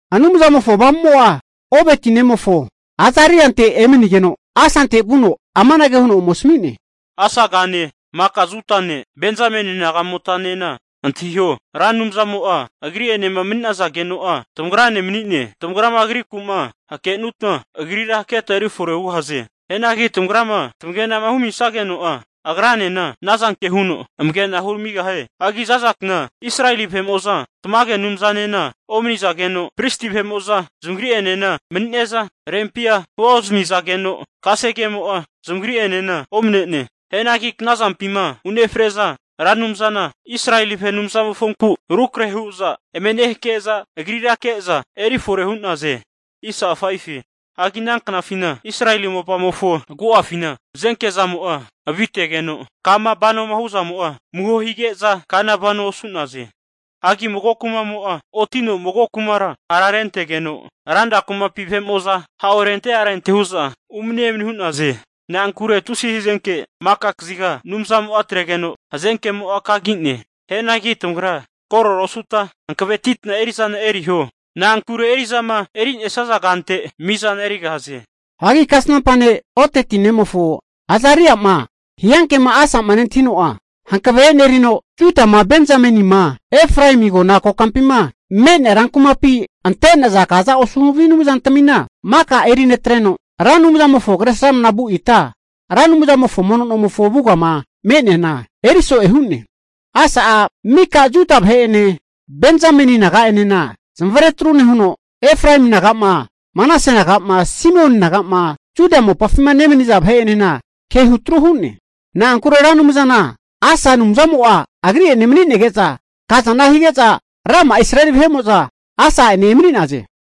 Anumzamofo Avamumo'a Obeti nemofo Azariante emanigeno, Asante vuno amanage huno ome asmi'ne, Asagane maka Judane Benzameni nagamotanena antahiho, Ra Anumzamo'a, Agri'enema mani'nazageno'a tamagrane mani'ne. Tamagrama Agriku'ma hakenutma Agrira haketa eri fore hugahaze. Hianagi tamagrama tamagenama humisageno'a, Agranena ana zanke huno amagena huramigahie. Hagi za'za kna Israeli vahe'mo'za tamage Anumzanena omanizageno, pristi vahe'mo'za zamagri'enena manine'za rempia huozmizageno, kasegemo'a zamagri'enena omne'ne. Hianagi knazampima unefre'za Ra Anumzana Israeli vahe Anumzamofonku rukrahe hu'za eme nehake'za, Agrira ke'za eri fore hu'naze. Hagi ana knafina Israeli mopamofo agu'afina hazenke zamo'a avitegeno, kama vanoma hu'zamo'a amuho hige'za kana vanoa osu'naze. Hagi mago kumamo'a otino mago kumara ha'rentegeno, ranra kumapi vahe'mo'za ha orente arente hu'za umani emani hu'naze. Na'ankure tusi hazenke maka kaziga Anumzamo'a atregeno hazenkemo kagi'ne. Hianagi tamagra korora osuta hankavetitma eri'zana eriho. Na'ankure eri'zama erinesaza kante mizana erigahaze. Hagi kasnampa ne' Odeti nemofo Azaria'ma hiankema Asa'ma nentahino'a, hankave e'nerino Judama, Benzamenima, Efraemi agona kokampima me'nea rankumapima ante'naza kaza osu havi anumzatmina maka eri netreno, Ra Anumzamofo kresramna vu ita Ra Anumzamofo mono nomofo avugama me'neana, eri so'e hu'ne. Asa'a mika Juda vahe'ene Benzameni naga'enena zamavare atru nehuno, Efraemi naga'ma Manase naga'ma Simeoni naga'ma Juda mopafi nemaniza vahe'enena kehu atru hu'ne. Na'ankure Ra Anumzana Asa Anumzamo'a agri'ene mani'nege'za kazana hige'za, rama'a Israeli vahe'mo'za Asa'ene emani'naze.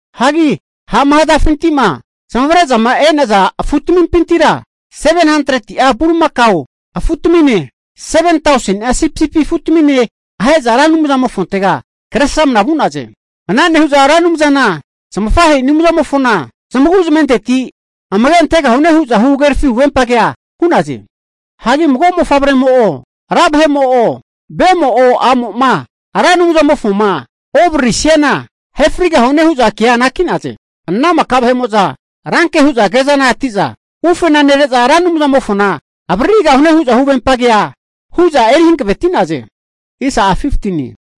Hagi ha'ma hazafinti'ma zamavare'zama e'naza afutmimpintira 700'a bulimakao afutamine, 7tauseni'a sipisipi afutamine ahe'za Ra Anumzamofontega Kresramana vu'naze. Ana nehu'za Ra Anumzana zamafahe'i Anumzamofona zamagu'zmenteti amage antegahune hu'za huhagerafi huvempagea hu'naze. Hagi mago mofavremo'o, ra vahe'mo'o, vemo'o, a'mo'ma Ra Anumzamofoma ovararisiana ahe frigahune hu'za kea anaki'naze. Ana maka vahe'mo'za ranke hu'za kezaneti'za, ufena nere'za Ra Anumzamofona avaririgahune hu'za huvempa kea hu'za eri hankaveti'naze.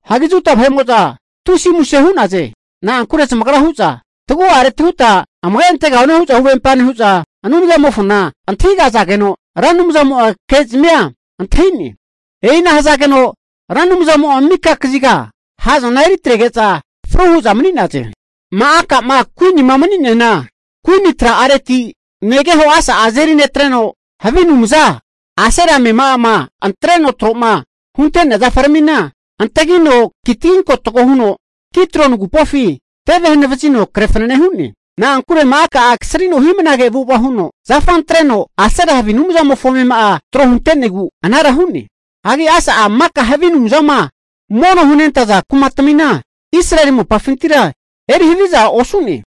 Hagi Juda vahe'mo'za tusi muse hu'naze. Na'ankure zamagra hu'za tagu'areti huta amage antegahune hu'za huvempa nehu'za Anumzamofona antahigazageno, Ra Anumzamo'a kezmia antahi'ne. E'ina hazageno Ra Anumzamo'a mika kaziga ha'zana eri atrege'za, fru hu'za mani'naze. Ma'aka'ma kuinima mani'neana kuini tra'aretira negeho Asa'a azeri netreno, havi anumza Asera amema'ama antreno tro'ma hunte'nea zafaramina antagino kitaginkotago huno Kidroni agupofi teve hanavazino kre fanane hu'ne. Na'ankure Ma'aka'a kasrino hi'mnage avu'ava huno, zafa antreno Asera havi anumzamofo amema'a tro hunte'negu anara hu'ne. Hagi Asa'a maka havi anumzama mono'ma hunentaza kumatmina Israeli mopafintira eri havizana osune.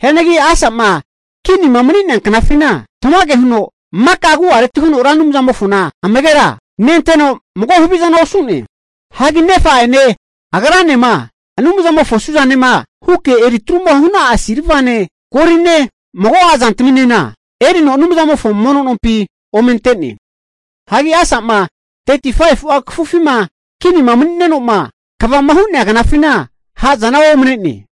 Hianagi Asa'ma kinima mani'nea knafina tamage huno maka agu'areti huno Ra Anumzamofona amagera nenteno mago havizana osu'ne. Hagi nefa'ene agranema Anumzamofo suzanema huke eri atru hu'na'a silvane goline mago'a zantaminena, erino Anumzamofo mono nompi ome ante'ne. Hagi Asa'ma 35'a kafufima kinima mani'neno'ma kvama hu'nea knafina, ha'zana omane'ne.